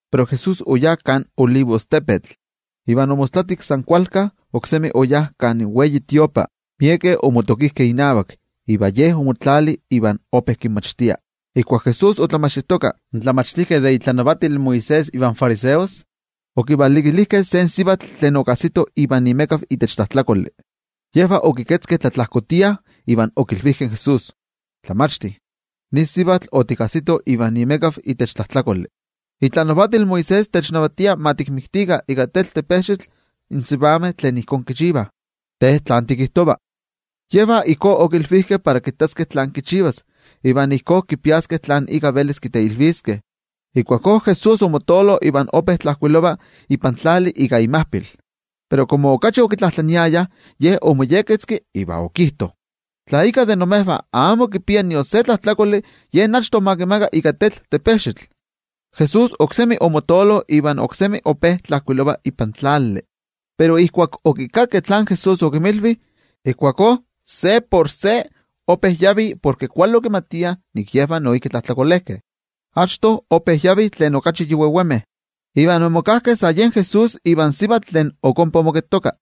Pero Jesús oyá kan Olivostepetl, iva omostlatik san kualka, oksemi oyá kan templo. Miekeh omotokijkeh inavak, iva Ye omotlali ope kinmachtia. Ijkuak Jesús otlamachtijtoka, in tlamachtijkeh de itlanavatil Moisés iva in fariseos okivalikilijkeh se sivatl tlen okajsitoh ivan imekav itech tlajtlakoli. Yejvah okiketzkeh tlatlajkotia, iva okilvijkeh in Jesús: —Tlamachti, nin sivatl otikajsitoh ivan imekav itech tlajtlakoli. Itlanavatil Moisés technavatia ma tikinmiktikah ika tetl in sivameh tlen ijkó kichivah. Te, ¿tlán tikijtova? Yejvah ijkó okilvijkeh para kittaskeh tlán kichivas, iva ijkó kipiaskeh tlen ika velis kiteilviskeh. Ijkuakó Jesús omotoolo iva ope tlajkuilova ipan tlali ika imajpil. Pero komo okachi okitlajtlaniayah, Ye omoyekketzki iva okijto: —Tla íkka de imejvah amo kipia nion se tlajtlakoli, yen achto ma kimaka ika tetl. Jesús oksemi omotoolo iva oksemi ope tlajkuilova ipan tlali. Pero ijkuak okikakkeh tlen Jesús okinmilvi, ijkuakó se por se ope yavih porke kuali okimatiah nik yejvah noijki tlajtlakolejkeh. Achto ope yavih tlen okachi yi vevemeh, iva omokajkeh sa yen Jesús ivan sivatl tlen ok ompa omoketoka.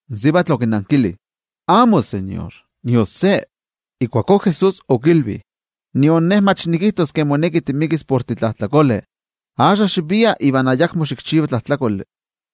In sivatl okinankili: —Amó, noTeko, ayakmika. Ijkuakó Jesús okilvi: —Nion Ne mach nikijtos nik moneki timikis. Axka xivia iva ayakmo xikchiva tlajtlakoli.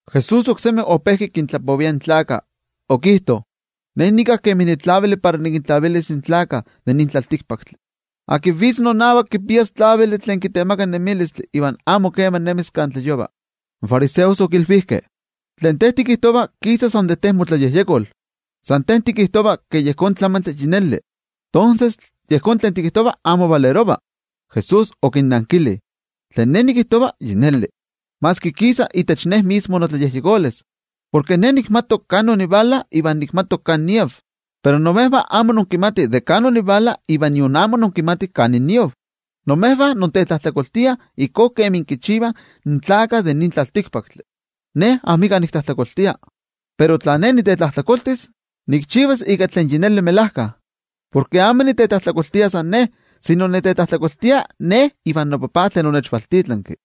Jesús oksemi ope kintlapovia in gentejtih, okijto: —Ne nika kemi nitlavili para nikintlavilis in tlaltikpaktlakah. Tlen vitz nonavak, kipias tlavili tlen kitemaka nemilistli, iva amo kema nemis kan tlayova. In fariseos okilvijkeh: —Tlen te tikijtova kisa san de te motlayejyekol. San te tikijtova ke yejón tlamantli yi neli. Tonses, yejón tlen tikijtova amitla ipati. Jesús okinnankili: —Tlen Ne nikijtova yi neli kipia ipati, maski kisa de Ne mismo. Porke Ne nikmati de kan onivala iva nikmati kan niav. Pero imejvah amo inkimatih de kan onivala iva nion amo inkimatih kan niav. Imejvah intetlajtlakoltiah ijkó kemi kichivah in tlaltikpaktlakah. Ne amika niktlajtlakoltia. Pero tla Ne nitetlajtlakoltis, nikchivas ika tlen yi neli melajka, porke amo nitetlajtlakoltia san Ne, sino nitetlajtlakoltia Ne ivan noTajtzi tlen onechvaltitlanki.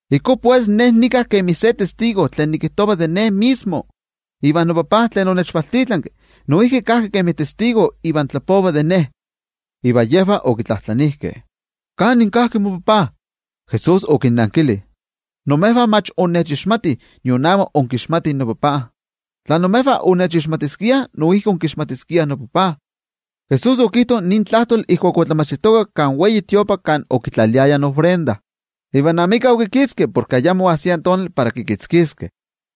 Ijkó pues, Ne nika kemi se testigo tlen nikijtova de Ne mismo, ivan noTajtzi tlen onechvaltitlanki kajki kemi oksé testigo. Iva yejvah okitlajtlanijkeh: —¿Kanin kajki moTajtzi? Jesús okinnankili: —Imejvah mach innechixmatih, nion amo inkixmatih noTajtzi. Tla imejvah onnechixmatiskiah, noijki onkixmatiskiah noTajtzi. Jesús okijto nin tlajtoli ijkuak otlamachtijtoka kan templo kan okitlaliayah in ofrendajtomi. Iva amika okikitzki porke ayamo oajsia tonali para kikitzkiskeh.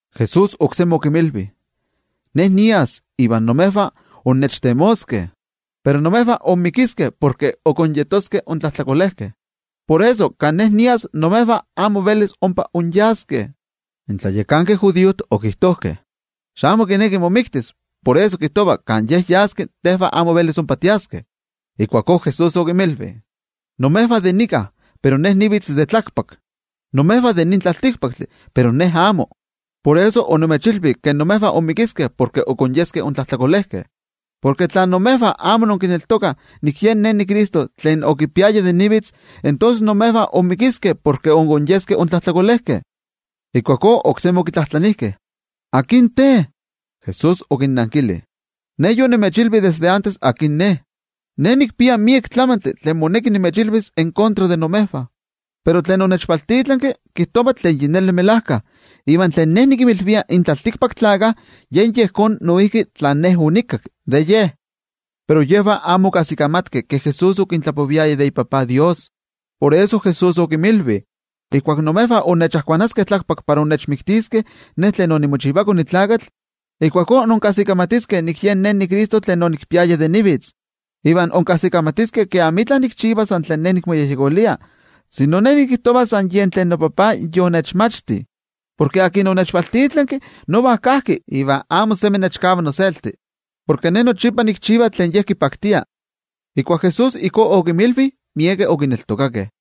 Jesús oksemi okinmilvi: —Ne nias, iva imejvah innechtemoskeh, pero imejvah inmikiskeh porke ok inyeskeh intlajtlakolejkeh. Por eso, kan Ne nias, imejvah amo velis ompa inyaskeh. In tlayakankeh judiojtih okijtojkeh: —¿Xamo kineki momiktis, por eso kijtova ke kan Ye yas tejvah amo velis ompa tiaskeh? Ijkuakó Jesús okinmilvi: —Imejvah de nika, pero Ne nivitz de tlakpak. Imejvah de nin tlaltikpaktli, pero Ne amo. Por eso onimechilvi ke imejvah inmikiskeh porke ok inyeskeh intlajtlakolejkeh. Porke tla imejvah amo inkineltokah nik Yen Ne niCristo, tonses imejvah inmikiskeh porke ok inyeskeh intlajtlakolejkeh. Ijkuakó oksemi okitlajtlanijkeh: —¿Akin te? Jesús okinnankili: —Ne yonimechilvi desde achto akin Ne. Ne nikpia miek tlamantli tlen moneki nimechilvis en kontra de imejvah. Pero tlen onechvaltitlanki, kijtova tlen melajkayotl, iva tlen Ne nikinmilvia in tlaltikpaktlakah yen yejón noijki tlen Ne onikakki de Ye. Pero yejvah amo okajsikamatkeh ke Jesús okintlapoviaya de iTajtzi. Por eso Jesús okinmilvi: —Ijkuak imejvah inkajkuanaskeh tlakpak para inkixpoloskeh iKone in Tlakatl, ijkuakó inkajsikamatiskeh nik Yen Ne niCristo. Iva inkajsikamatiskeh ke amitla nikchiva san tlan Ne nikmoyejyekolia, sino Ne nikijtova san yen tlen noTajtzi yonechmachti. Porke tlen onechvaltitlanki nova kajki iva amo semi nechkava noselti, porke Ne nochipa nikchiva tlen Ye kipaktia. Ijkuak Jesús ijkó okinmilvi, miekeh okineltokakeh.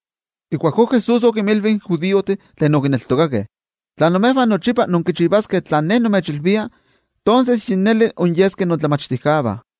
Ijkuakó Jesús okinmilvi in judiojtih tlen okineltokakeh: —Tla imejvah nochipa inkichivaskeh tlen Ne nimechilvia, tonses yi neli inyeskeh inmomachtijkeh de Ne,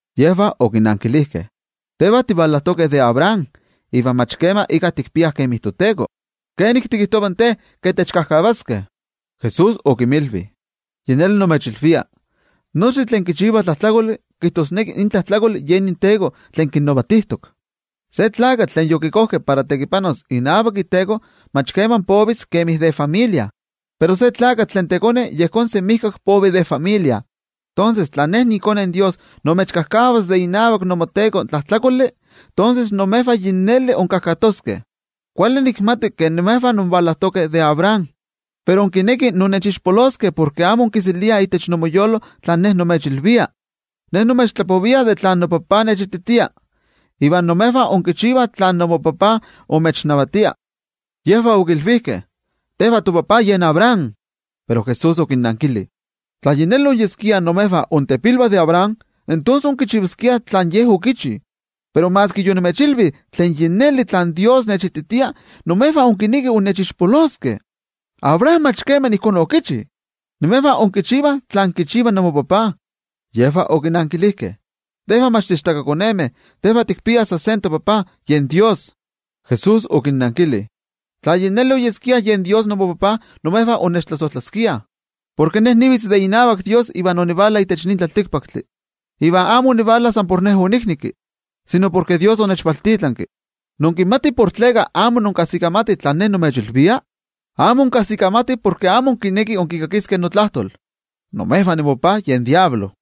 Yejvah okinankilijkeh: —Tejvah tivalajtokeh de Abraham, iva mach kema íkka tikpiah kemi toteko, ¿kenik tikijtova in te ke tikajkatoskeh? Jesús okinmilvi: —Yi neli nimechilvia, nochtin tlen kichivah tlajtlakoli, kijtosneki in tlajtlakoli yen inteko tlen kinnavatijtok. Se tlakatl tlen yokikojkeh para tekipanos inavak iteko mach kema povis kemi de familia, pero se tlakatl tlen tekone yejón semijkak povi de familia. Tonses, tla iKone in Dios imechkajkavas de inavak inmoteko tlen tlajtlakoli, tonses imejvah yi neli inkajkatoskeh. Kuali nikmati ke imejvah invalajtokeh de Abraham. Pero inkinekih innechixpoloskeh porke amo inkiseliah itech inmoyolo tlen Ne nimechilvia. Ne nimechtlapovia de tlen noTajtzi nechititia, iva imejvah inkichivah tlen inmopapa imechnavatia. Yejvah okilvijkeh: —¡Tejvah topapa yen Abraham! Pero Jesús okinnankili: —Tla yi neli oyeskia intepilvah de Abraham, tonses onkichivaskiah tlen ye okichi. Pero maski yonimechilvi tlen yi neli tlen Dios nechititia, imejvah inkinekih innechixpoloskeh. ¡Abraham mach kema ijkó okichi! Imejvah inkichivah tlen kichiva inmopapa. Yejvah okinankilijkeh: —Tejvah mach tiichtakakonemeh, tejvah tikpiah san se topapa, yen Dios. Jesús okinnankili: —Tla yi neli oyeskia yen Dios inmopapa, onnechtlasojtlaskiah, porke Ne nivitz de inavak Dios iva onivala itech nin tlaltikpaktli. Iva amo onivala san por Ne oniknekki, sino porke Dios onechvaltitlanki. ¿Inkimatih tleka amo inkajsikamatih tlen Ne nimechilvia? Amo inkajsikamatih porke amo inkinekih inkikakiskeh notlajtol. Imejvah inmopapa yen Amo Kuali Tlakatl,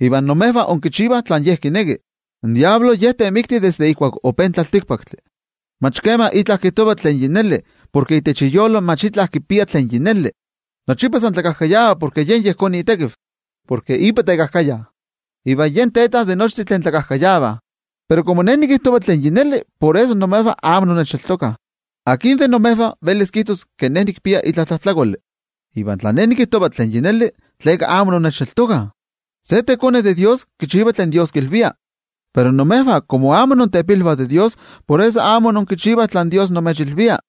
ivan imejvah inkichivah tlen ye kineki. In Amo Kuali Tlakatl ye temikti desde ijkuak ope in tlaltikpaktli. Mach kema kijtova itla melajkayotl porke itech iyolo mach itla kipia tlen melajkayotl. Nochipa san tlakajkayava porke yen yejón itekiv, porke ipa tekajkaya, iva yen teta de nochtin tlen tlakajkayavah. Pero komo Ne nikijtova tlen yi neli, por eso imejvah amo innechneltokah. ¿Akin de imejvah velis kijtos ke nikpia itla tlajtlakoli? Iva tla Ne nikijtova tlen melajkayotl, ¿tleka amo innechneltokah? Se tekone de Dios, kichiva tlen Dios kilvia. Pero imejvah komo amo intepilvah de Dios, por eso amo inkichivah tlen Dios imechilvia.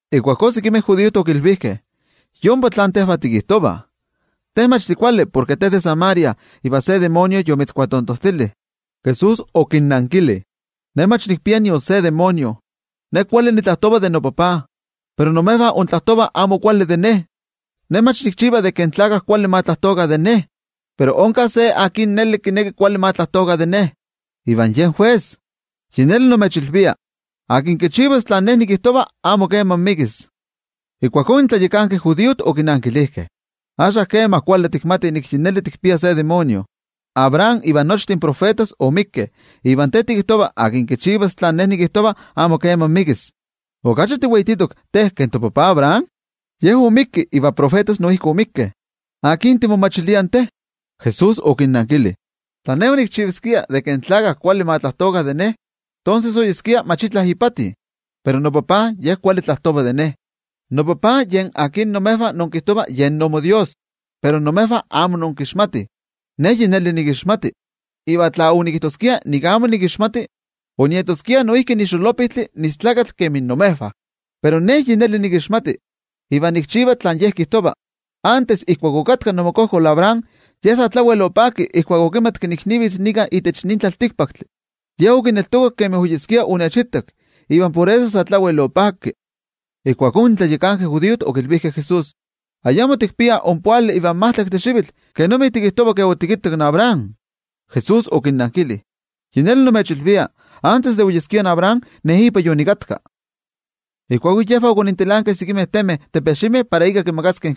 Ijkuakó sekimeh judiojtih okilvijkeh: —Yompa tlen tejvah tikijtovah, te mach tikuali porke te de Samaria iva tikpia se amo kuali ejekatl. Jesús okinnankili: —Ne mach nikpia nion se amo kuali ejekatl. Ne kuali nitlajtova de noTajtzi, pero imejvah intlajtovah amo kuali de Ne. Ne amo nikchiva ke in tlaltikpaktlakah kuali ma tlajtokah de Ne. Pero onka se tlen akin yi neli kineki kuali ma tlajtokah de Ne, iva yen jues. Yi neli nimechilvia, tlen akin kichivas tlen Ne nikijtova, amo kema ixpolivis. Ijkuakó in tlayakankeh judiojtih okinankilijkeh: —Axka kema kuali tikmatih nik yi neli tikpia se amo kuali ejekatl. Abraham iva nochtin tiotenejmachtijkeh oixpolikeh, iva te tikijtova: “Tlen kichivas tlen Ne nikijtova, amo kema ixpolivis.” ¿Okachi tiweititok te ke topapa Abraham? Ye oixpolivik, iva in tiotenejmachtijkeh noijki oixpolikeh. ¿Akin timomachilia in te? Jesús okinnankili: —Tla Ne onikchivaskia ke in tlaltikpaktlakah kuali ma tlajtokah de Ne, tonses amitla ipati oyeskia. Pero noTajtzi Ye kuali tlajtova de Ne, noTajtzi yen tlen imejvah inkijtovah yen inmoDios. Pero imejvah amo inkixmatih. Ne yi neli nikixmati, iva tla onikijtoskia nik amo nikixmati, onieskia noijki nitekajkaya kemi imejvah. Pero Ne yi neli nikixmati, iva nikchiva tlen Ye kijtova. Achto ijkuak okatka inmokojkol Abraham, ye sa tlawel opakki ijkuak okittak ke okachi tlayakapa nivitz itech nin tlaltikpaktli. Ye okittak iva sa tlawel opakki. Ijkuakó in tlayakankeh judiojtih okilvijkeh in Jesús: —Ayamo tikpia ompoali ivan majtlaktli xivitl, ¿kenomi tikijtova ke otikittak in Abraham? Jesús okinnankili: —Yi neli nimechilvia, antes de oyeskia in Abraham, Ne ipa yonikatka. Ijkuakó yejvah okonintilankeh sekimeh temeh para ika kimakaskeh,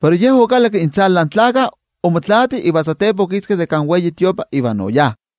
pero Jesús okalakki intzala in gentejtih omotlaati iva satepa okiski de kan templo iva oyá.